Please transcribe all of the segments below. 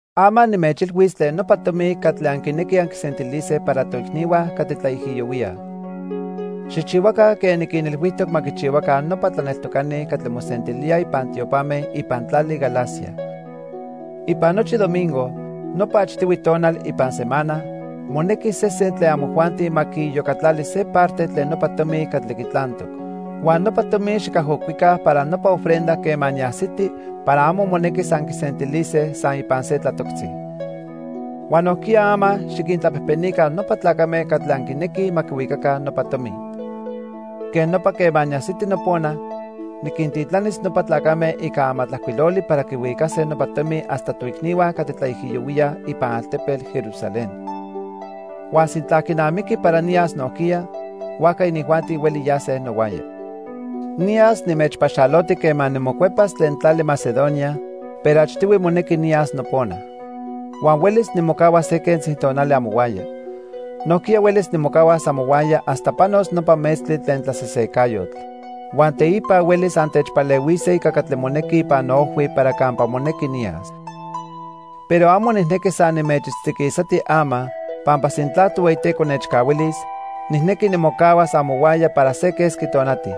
Ama nimechilhuis tlen nopa tomi catli anquinequij anquisentilise para toicnihua catli tlaijiyohuíaj. Xijchihuaca quen niquinilhuijtoc ma quichihuaca nopa tlaneltocani catli mosentilíaj ipan tiopame ipan tlali Galacia. Ipan nochi domingo, nopa achtihui tonal ipan semana, monequi sesen tlen amojuanti ma quiiyocatlali se parte tlen nopa tomi catli quitlantoc. Huan nopa tomi xicajocuica para nopa ofrenda quema niajsiti para amo monequis anquisentilise san ipan se tlatoctzi. Huan nojquiya ama xiquintlapejpenica nopa tlacame catli anquinequij ma quihuicaca nopa tomi. Quej nopa quema niajsiti nopona, niquintitlanis nopa tlacame ica amatlajcuiloli para quihuicase nopa tomi hasta toicnihua catli tlaijiyohuíaj ipan altepetl Jerusalén. Huan sintla quinamiqui para niyas nojquiya, huajca inijuanti hueli yase nohuaya. Niyas nimechpaxaloti quema nimocuepas tlen tlali Macedonia pero achtihui monequi niyas nopona. Huan huelis nimocahuas se quentzi tonali amohuaya. Nojquiya huelis nimocahuas amohuaya hasta panos nopa metztli tlen tlasesecayotl. Huan teipa huelis antechpalehuise ica catli monequi ipan noojhui para campa monequi niyas. Pero amo nijnequi san nimechitztiquisati ama, pampa sintla Tohueyiteco nechcahuilis, nijnequi nimocahuas amohuaya para se quesqui tonati.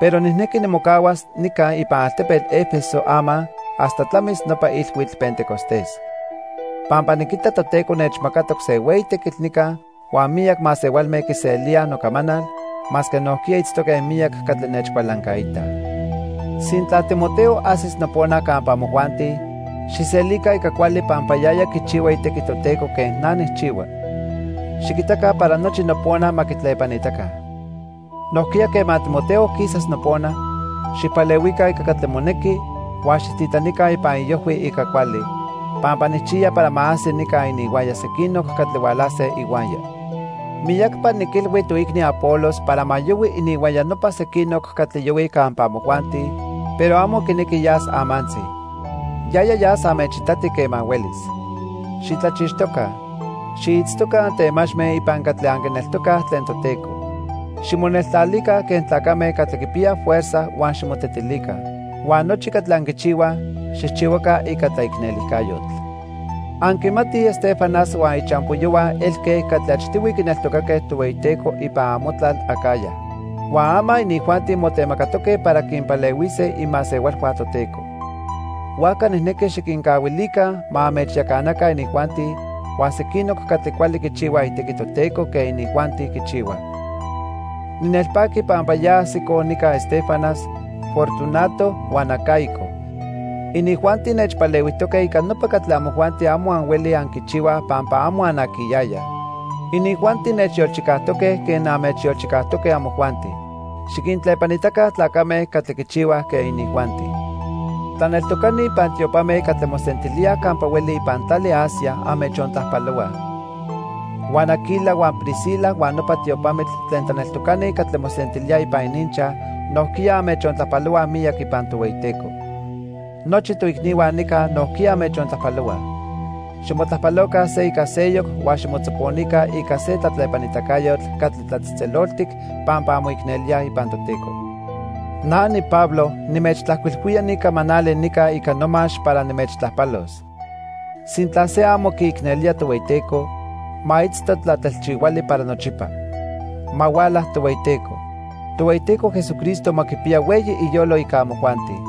Pero nijnequi nimocahuas nica ipan altepetl 'Efeso ama hasta tlamis nopa Ilhuitl Pentecostés. Pampa niquita Toteco nechmacatoc se hueyi tequitl nica huan miyac masehualme quiselíaj nocamanal, masque nojquiya itztoque miyac catli nechcualancaitaj. Sintla Timoteo ajsis nopona campa amojuanti, xijselica ica cuali pampa yaya quichihua itequi Toteco quen na nijchihua. Xiquitaca para nochi nopona ma quitlepanitaca. Nojquiya quema Timoteo quisas nopona, xijpalehuica ica catli monequi huan xijtitlanica ipan iojhui ica cuali, pampa nijchiya para ma ajsi nica ininhuaya sequinoc catli hualase ihuaya. Miyacpa niquilhui toicni Apolos para ma yohui ininhuaya nopa sequinoc catli yohuij campa amojuanti, pero amo quinequi yas amantzi. Yaya yas anmechitati quema huelis. Xitlachixtoca. Xiitztoca antemachme ipan catli anquineltocaj tlen Toteco. Ximoneltlalica quen tlacame catli quipiyaj fuerza huan ximotetilica. Huan nochi catli anquichihuaj, xijchihuaca ica tlaicnelijcayotl. Anquimatij Estéfanas huan ichampoyohua elque catli achtihui quineltocaque Tohueyiteco ipan amotlal Acaya. Huan ama inijuanti motemacatoque para quinpalehuise imasehualhua Toteco. Huajca nijnequi xiquincahuilica ma anmechyacanaca inijuanti huan sequinoc catli cuali quichihuaj itequi Toteco quen inijuanti quichihuaj. Ninelpaqui pampa ya ajsicoj nica Estéfanas, Fortunato, huan Acaico. Inijuanti nechpalehuijtoque ica nopa catli amojuanti amo anhuelij anquichihuaj pampa amo anaquiyayaj. Inijuanti nechyolchicajtoque quen anmechyolchicajtoque amojuanti. Xiquintlepanitaca tlacame catli quichihuaj quen inijuanti. Tlaneltocani ipan tiopame catli mosentilíaj campa hueli ipan tlali Asia anmechontlajpalohuaj. Huan Aquila huan Priscila huan nopa tiopamitl tlen tlaneltocani catli mosentilíaj ipan ininchaj nojquiya anmechontlajpalohuaj miyac ipan Tohueyiteco. Nochi toicnihua nica nojquiya anmechontlajpalohuaj. Ximotlajpaloca se ica seyoc huan ximotzoponica ica se tlatlepanitacayotl catli tlatzejtzeloltic pampa anmoicnelíaj ipan Toteco. Na niPablo nimechtlajcuilhuía ni camanali nica ica nomax para nimechtlajpalos. Sintla se amo quiicnelía Tohueyiteco, ma itzto tlatelchihuali para nochipa. Ma huala Tohueyiteco. Tohueyiteco Jesucristo ma quipiya hueyi iyolo ica amojuanti.